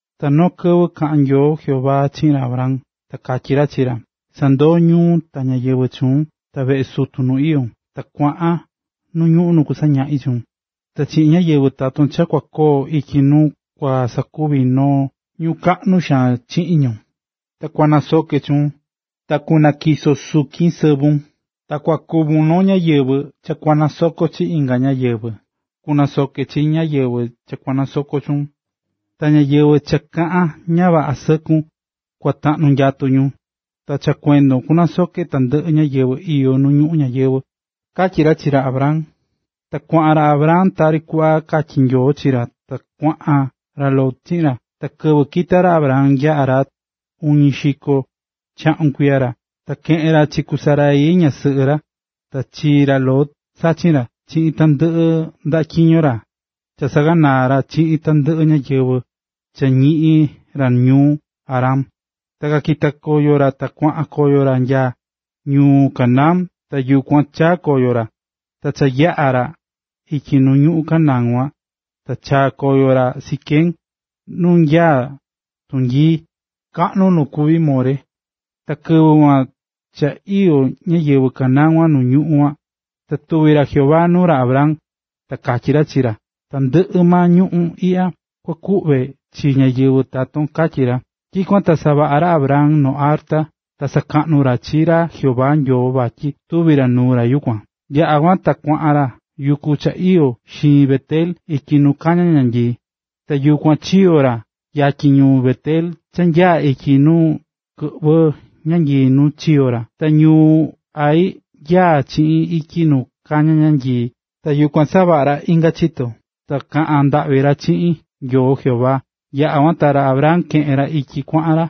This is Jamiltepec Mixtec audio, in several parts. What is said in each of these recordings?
Ta noo kɨvɨ kaꞌa̱n Nyoo Jehová chiꞌin ra Abram, ta katyí ra chi ra: “Sa̱ndoo ñuun, ta ñáyɨvɨ chuun, ta veꞌe sutun nu iyón, ta kuaꞌan nu ñuꞌún nu kusañaꞌi chuun. Ta chiꞌin ñáyɨvɨ taton cha kua koo ityi nuu kua sakuvi noo ñuu kaꞌnu xaan chiꞌin ñu, ta kunasoke chuun, ta kunatyiso sukin sɨvun, ta kua kuvun noo ñáyɨvɨ cha kua nasoko chi inga ñáyɨvɨ. Kunasoke chi ñáyɨvɨ cha nasokó chuun, ta ñáyɨvɨ cha kaꞌán ña vaꞌa sɨkun, kua taꞌnu nyatu ñu. Ta cha kuendon kunasoke tandɨꞌɨ ñáyɨvɨ iyó nu ñuꞌún ñayɨvɨ̱”, katyí ra chi ra Abram. Ta kuaꞌan ra Abram tari kuꞌva katyí Nyoo chi ra, ta kuaꞌan ra Lot chiꞌin ra. Ta kɨvɨ kita̱ ra Abram nya Harán, uñi xiko chaꞌun kuiya ra. Ta keꞌe̱n ra chi ku Sarai, ñasɨꞌɨ ra, ta chi ra Lot, sachin ra, chiꞌin tandɨꞌɨ ndaꞌa tyiño ra cha saꞌaganaa̱ ra chiꞌin tandɨꞌɨ ñáyɨvɨ cha ñiꞌi̱n ra ñuu Harán. Ta kakita̱ ra ta kuaꞌan koyo ra nya ñuu Canaán, ta yukuan chaa̱ koyo ra. Ta kayaꞌa̱ ra ityi nu ñuꞌún Canaán kuan ta chaa̱ koyo ra Siquem, nu nanyaá tunyiia kaꞌnu nu kuví More. Ta kɨvɨ kuan ka iyó ñáyɨvɨ Canaán nu ñuꞌún kuan. Ta tuvi̱ ra Jehová nuu ra Abram, ta katyí ra chi ra: “Tandɨꞌɨ maa ñuꞌún iꞌya kua kuꞌve chi ñáyɨvɨ taton”, katyí ra. Tyikuan ta savaꞌa̱ ra Abram noo arta nu sakaꞌnú ra chi ra Jehová Nyoo vatyi tuvi̱ ra nuu ra yukuan. Yaꞌa̱ kuan ta kuaꞌan ra yuku cha iyó xiin Bet-el ityi nu kañá ñanyii. Ta yukuan chiyo̱ ra yatyin ñuu Bet-el cha nyaá ityi nu kɨꞌvɨ́ ñanyii nu chikoo̱ ra, ta ñuu Hai nyaá chi ityi nu kañá ñanyii. Ta yukuan savaꞌa̱ ra inga chito, ta kaꞌa̱n ndaꞌvi ra chiꞌin Nyoo Jehová. Yaꞌa kuan ta ra Abram keꞌe̱n ra ityi kuaꞌan ra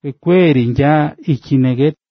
kuee kuee ri nya ityi Neguev.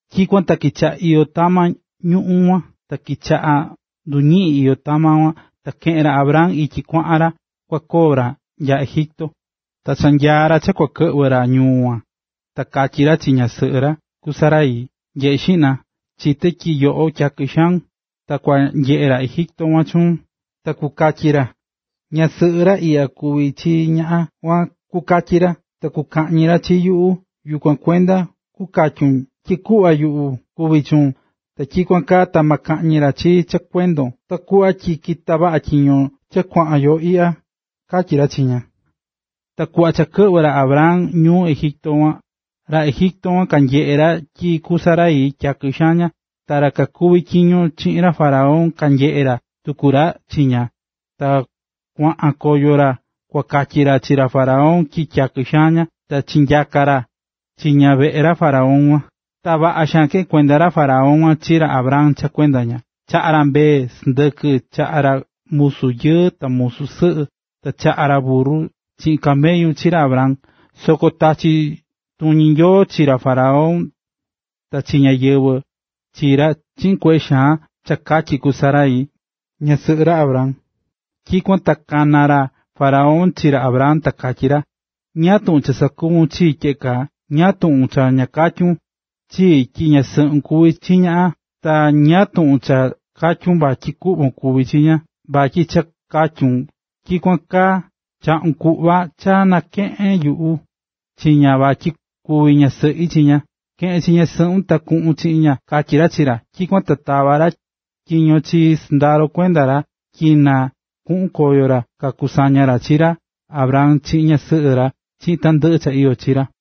Tyikuan ta kichaꞌa̱ iyó tama ñuꞌún kuan, ta kichaꞌa̱ nduñiꞌín iyó tama kuan, ta keꞌe̱n ra Abram ityi kuaꞌan ra kua koo ra nya Egipto. Ta cha nyaá ra cha kua kɨꞌvɨ ra ñuu kuan, ta katyí ra chi ñasɨꞌɨ ra, ku Sarai: “Nye̱ꞌe xiꞌna, chité tyi yoꞌo tyakɨ xaun. Ta kua nyeꞌe ra Egipto kuan chuun, ta kukatyi ra: ‘Ñasɨꞌɨ ra ikan kuví chi ñaꞌan kuan’, kukatyi ra. Ta kukaꞌñi ra chi yuꞌu. Yukuan kuenda kukatyun tyi kuꞌva yuꞌu kuví chuun, ta tyikuan kaa ta ma kaꞌñi ra chii cha kuendon ta kuꞌva tyi kita vaꞌa tyiño cha kuaꞌan yo iꞌya”, katyí ra chi ña. Ta kuꞌva cha kɨꞌvɨ̱ ra Abram ñuu Egipto kuan, ra Egipto kuan kanyeꞌe̱ ra tyi ku Sarai, tyakɨ xaan ña. Ta ra kakuví tyiño chiꞌin ra faraón, kanyeꞌe̱ tuku ra chi ña ta kuaꞌan koyo ra kuakatyi ra chi ra faraón tyi tyakɨ xaan ña. Ta chinyaka̱ ra chi ña veꞌe ra faraón kuan. Ta vaꞌa xaan keꞌe̱n kuenda ra faraón chi ra Abram cha kuenda ña. Chaꞌa̱ ra mbee, sɨndɨkɨ, chaꞌa̱ ra musu yɨɨ, ta musu sɨꞌɨ, ta chaꞌa̱ ra burru chiꞌin camellu chi ra Abram. Soko tachi̱ tuñi Nyoo chi ra faraón ta chi ñáyɨvɨ chi ra chiꞌin kueꞌe xaan cha katyi ku Sarai, ñasɨꞌɨ ra Abram. Tyikuan ta kana̱ ra faraón chi ra Abram, ta katyí ra: “¿Ñáá tuꞌun cha sakuvu̱n chii tyeꞌe kaa? ¿Ñáá tuꞌun cha ña katyu̱n chii tyi ñasɨꞌun kuví chi ña? Ta ¿ñáá tuꞌun cha katyu̱n vatyi kuꞌvon kuví chi ña? Vatyi cha katyun tyikuan kaa, chaꞌu̱n kuꞌva cha nakeꞌe̱n yuꞌu chi ña vatyi kuvi ñasɨꞌi chi ña. ¡Ke̱ꞌen chi ñasɨꞌun ta kuꞌun chiꞌin ña!”, katyí ra chi ra. Tyikuan ta tava̱ ra tyiño chi sɨndaro kuenda ra tyi na kuꞌun koyo ra kakusaña ra chi ra Abram chiꞌin ñasɨꞌɨ ra chiꞌin tandɨꞌɨ cha iyó chi ra.